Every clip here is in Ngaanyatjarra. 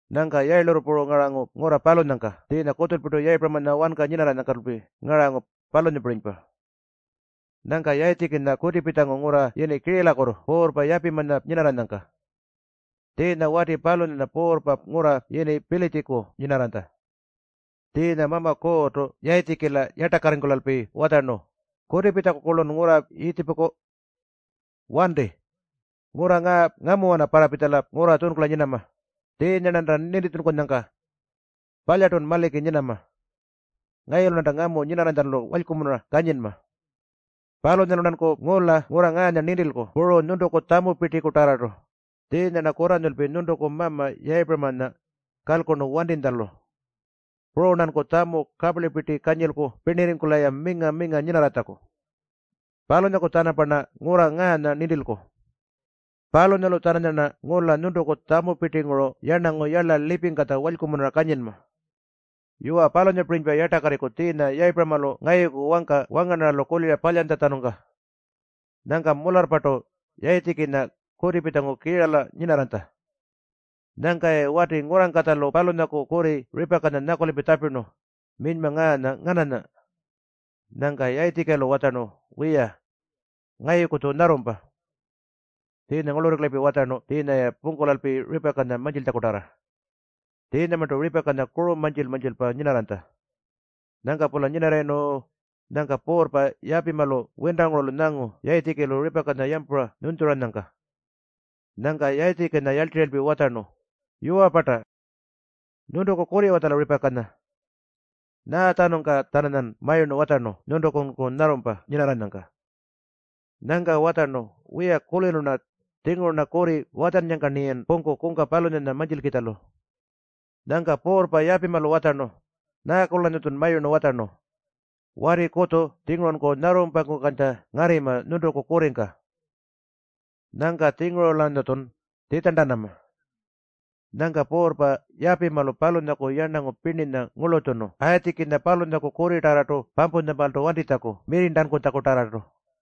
Nyangka yayilurru puru ngarangu ngurra palunyangka tjiinya kutjulpirtu Yayipuramanya wanka nyinarranyangkalpi ngarangu, palunyapirinypa. Nyangka Yayitjikinya kutipitjangu ngurra yini Kiiralakutu puurrpa Yapimanya nyinarranyangka. Tjiinya wati palunyanya puurrpa ngurra yini Pilitjiku nyinarranytja. Tjiinya Mama Kuurrtu Yayitjikila yartakarringkulalpi watjarnu, “Kutipitjaku-kurlun ngurra Yiitjipuku. Wanti. Ngurra ngaa ngamuwana parrapitjala ngurra tjunkula nyinama, tjiinya-rnanta nintitjunkunyangka. Palyartun maliki nyinama. Ngayulu-rnanta ngamu nyinarranytjalu walykumunura kanyinma. Palunyalu-rnanku ngula ngurra ngaanya nintilku puru nyuntuku tjamupirtikutarrartu, tjiinya-rna kurranyululpi nyuntuku mama Yayipuramanya kalkurnu wantinytjalu. Puru-rnanku tjamu kaparlipirti kanyilku pirnirringkula-ya minga-minga nyinarratjaku. Palunyalu-tjanamparna ngurra ngaanya nintilku. Palunyalu-tjananyarna ngula nyuntuku tjamupirtinguru yarnangu yarla lipingkatja walykumunura kanyinma. Yuwa, palunyapirinypa yartakarriku tjiinya Yayipuramalu ngayuku wangka wangarnarralu kulira palyantjatjanungka.” Nyangka mularrpartu Yayitjikinya kutipitjangu Kiirala nyinarranytja. Nyangka-ya wati ngurrangkatjalu palunyaku kurri Ripakanya nyakulalpi tjapirnu, “Minyma ngaanya ngananya?” Nyangka Yayitjikilu watjarnu, “Wiya, ngayuku-tju nyarrumpa.” Tjiinya ngurlurringkulalpi watjarnu tjiinya-ya pungkulalpi Ripakanya mantjiltjakutarra. Tjiinyamarntu Ripakanya kuru mantjil-mantjilpa nyinarranytja. Nyangka-pula nyinarrayirnu, nyangka puurrpa Yapimalu wintangurulu nyangu Yayitjikilu Ripakanya yampura nyunytjuranyangka. Nyangka Yayitjikinya yarltirralpi watjarnu, “Yuwa-parta? Nyuntuku kurri-watjala Ripakanya? Nyaatjanungka-tjananyan mayurnu watjarnu nyuntukunku nyarrumpa nyinarranyangka?” Nyangka watjarnu, “Wiya, kulirnu-rna tjinguru-rna kurri watjannyangka-rniyan pungku kungka palunyanya mantjilkitjalu.” Nyangka puurrpa Yapimalu watjarnu, “Nyaaku-lanyatjun mayurnu watjarnu? Wati kutju-tjingurunku nyarrumpakukantja ngarrima nyuntuku kurringka. Nyangka-tjinguru-lanyatjun tjitjarntanama.” Nyangka puurrpa Yapimalu palunyaku yarnangu pirninya ngurlutjunu Yayitjikinya palunyaku kurritarrartu pampuntjamaaltu wantitjaku mirrirntankutjakutarrartu.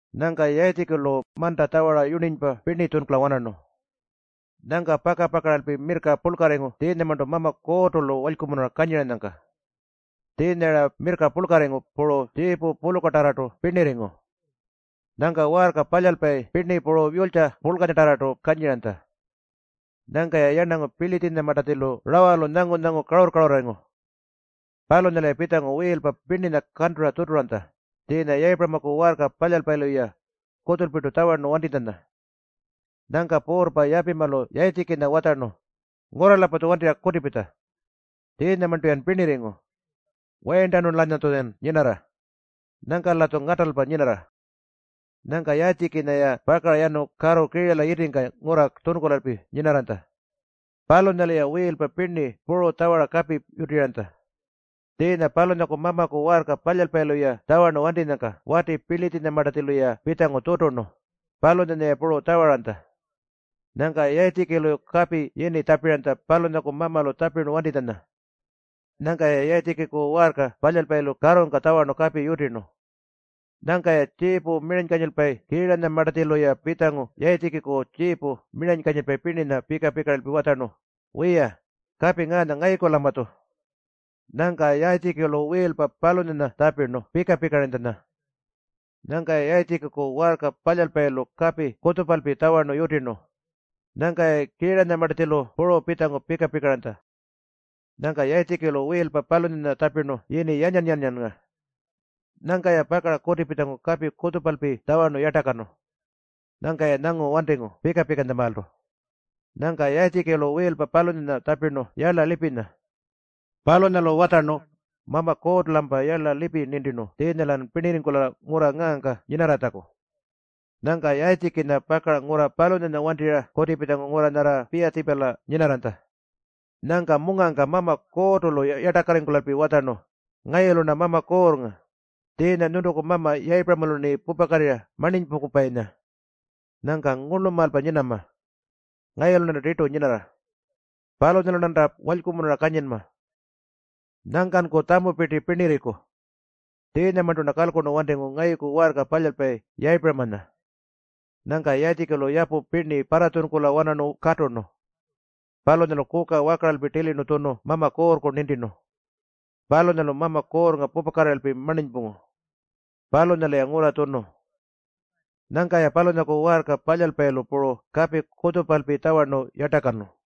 Nyangka Yayitjikilu manta tjawara yurninypa pirni tjunkula-wanarnu. Nyangka paka-pakaralpi mirrka purlkarringu tjiinyamarntu Mama Kuurrtu-lu walykumunura kanyiranyangka. Tjiinya-ra mirrka purlkarringu puru tjiipu pulukatarrartu pirnirringu. Nyangka waarka palyalpayi pirni puru yulytja purlkanyatarrartu kanyiranytja. Nyangka-ya yarnangu Pilitjinyamartatjilu rawalu nyangu-nyangu karurr-karurrarringu. Palunyalu-ya pitjangu wiilpa pirninya kantura tjuturanytja, tjiinya Yayipuramaku waarka palyalpayilu-ya kutjulpirtu tjawarnu wantinytjanya. Nyangka puurrpa Yapimalu Yayitjikinya watjarnu, “Ngurra-lampatju wantirra kutipitja. Tjiinyamarntu-yan pirnirringu. Wayirntanu-lanyatjuyan nyinarra. Nyangka-latju ngatalpa nyinarra.” Nyangka Yayitjikinya-ya pakara yanu karru Kiirala yitingka ngurra tjunkulalpi nyinarranytja. Palunyalu-ya wiilpa pirni puru tjawara kapi yutiranytja. Tjiinya palunyaku mamaku waarka palyalpayilu-ya tjawarnu wantinyangka wati Pilitjinyamartatjilu-ya pitjangu tjuturnu, palunyanya-ya puru tjawaranytja. Nyangka Yayitjikilu kapi yini tjapiranytja, palunyaku mamalu tjapintjanya. Nyangka-ya Yayitjikiku waarka palyalpayilu karrungka tjawarnu kapi yutirnu. Nyangka-ya tjiipu miranykanyilpayi Kiiranyamartatjilu pitjangu Yayitjikiku tjiipu miranykanyilpayi pirninya pika-pikaralpi watjarnu, “Wiya, kapi ngaanya ngayuku-lampatju.” Nyangka Yayitjikilu wiilpa palunyanya tjapirnu Pika-pikaranytjanya. Nyangka-ya Yayitjikiku waarka palyalpayilu kapi kutjupalpi tjawarnu yutirnu. Nyangka-ya Kiiranyamartatjilu puru pitjangu pika-pikaranytja. Nyangka Yayitjikilu wiilpa palunyanya tjapirnu yini Yanyan-yanyannga. Nyangka-ya pakara kutipitjangu kapi kutjupalpi tjawarnu yartakanu. Nyangka-ya nyangu wantingu pika-pikantjamaaltu. Nyangka Yayitjikilu wiilpa palunyanya tjapirnu Yarla Lipinya. Palunyalu watjarnu, “Mama Kuurrtu-lampa yarla lipi nintirnu tjiinya-lan pirnirringkula ngurra ngaangka nyinarratjaku.” Nyangka Yayitjikinya pakara ngurra palunyanya wantirra kutipitjangu ngurra nyarra Piyatjiipala nyinarranytja. Nyangka mungangka Mama Kuurrtu-lu yartakarringkulalpi watjarnu, “Ngayulu-rna Mama Kuurrnga, tjiinya nyuntuku mama Yayipuramalu-rni pupakatirra marninypungkupayinya. Nyangka ngurlumaalpa nyinama. Ngayulu-rnanta tirtu nyinarra. Palunyalu-rnanta walykumunura kanyinma. Nyangkanku tjamupirti pirnirriku. Tjiinyamarntu-rna kalkurnu wantingu ngayuku waarka palyalpayi Yayipuramanya.” Nyangka Yayitjikilu yapu pirni parratjunkula-wanarnu katurnu. Palunyalu kuka wakaralpi tilirnu tjunu Mama Kuurrku nintirnu. Palunyalu Mama Kuurrnga pupakatirralpi marninypungu. Palunyalu-ya ngurra tjunu. Nyangka-ya palunyaku waarka palyalpayilu puru kapi kutjupalpi tjawarnu yartakanu.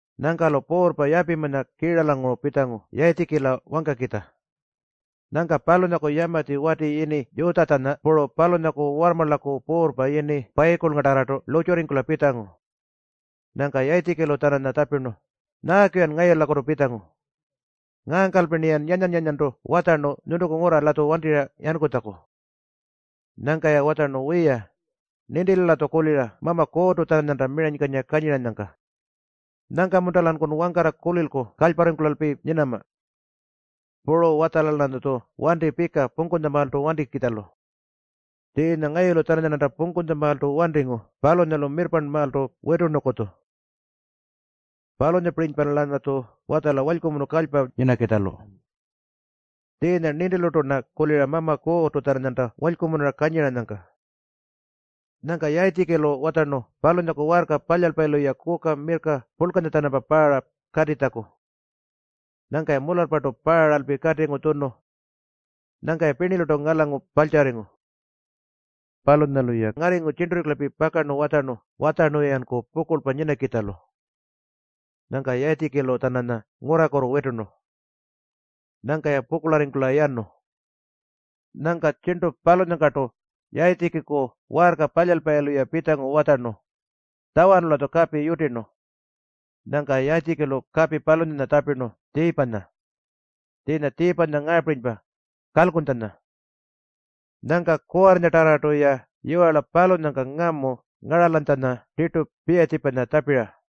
Nyangka-lu puurrpa Yapimanya Kiiralanguru pitjangu Yayitjikila wangkakitja. Nyangka palunyaku yamatji wati yini Yutjatjanya puru palunyaku warrmarlaku puurrpa yini Payikulngatarrartu lurrtjurringkula pitjangu. Nyangka Yayitjikilu-tjananya tjapirnu, “Nyaaku-yan ngayulakutu pitjangu? Ngaangkalpi-rniyan yanyan-yanyantu watjarnu nyuntuku ngurra-latju wantirra yankutjaku.” Nyangka-ya watjarnu, “Wiya, nintilu-latju kulira Mama Kuurrtu-tjananyanta miranykanyira kanyiranyangka. Nyangka-munta-lankun wangkarra kulilku kalyparringkulalpi nyinama? Puru watjala-lanyatju wanti pika pungkunytjamaaltu wantikitjalu. Tjiinya ngayulu-tjananyarnanta pungkunytjamaaltu wantingu palunyalu mirrparnmaaltu witurnukutju. Palunyapirinypa-lanyatju watjala walykumunu kalypa nyinakitjalu. Tjiinya nintilurtu-rna kulira Mama Kuurrtu-tjananyanta walykumunura kanyiranyangka.” Nyangka Yayitjikilu watjarnu palunyaku waarka palyalpayilu-ya kuka mirrka purlkanya-tjanampa paara katitjaku. Nyangka-ya mularrpartu paaralpi katingu tjunu. Nyangka-ya pirnilurtu ngalangu parltjarringu. Palunyalu-ya ngarringu tjirnturringkulalpi pakarnu watjarnu-yanku pukurlpa nyinakitjalu. Nyangka Yayitjikilu-tjananya ngurraku witurnu. Nyangka-ya pukurlarringkula yanu. Nyangka tjirntu palunyangkartu Yayitjikiku waarka palyalpayilu-ya pitjangu watjarnu, “Tjawarnu-latju kapi yutirnu.” Nyangka Yayitjikilu kapi palunyanya tjapirnu Tjiipanya. Tjiinya Tjiipanya ngaapirinypa, Kalkuntjanya. Nyangka kuwarrinyatarrartu-ya yiwarla palunyangka ngamu ngaralanytjanya tirtu Piyatjiipanya tjapira.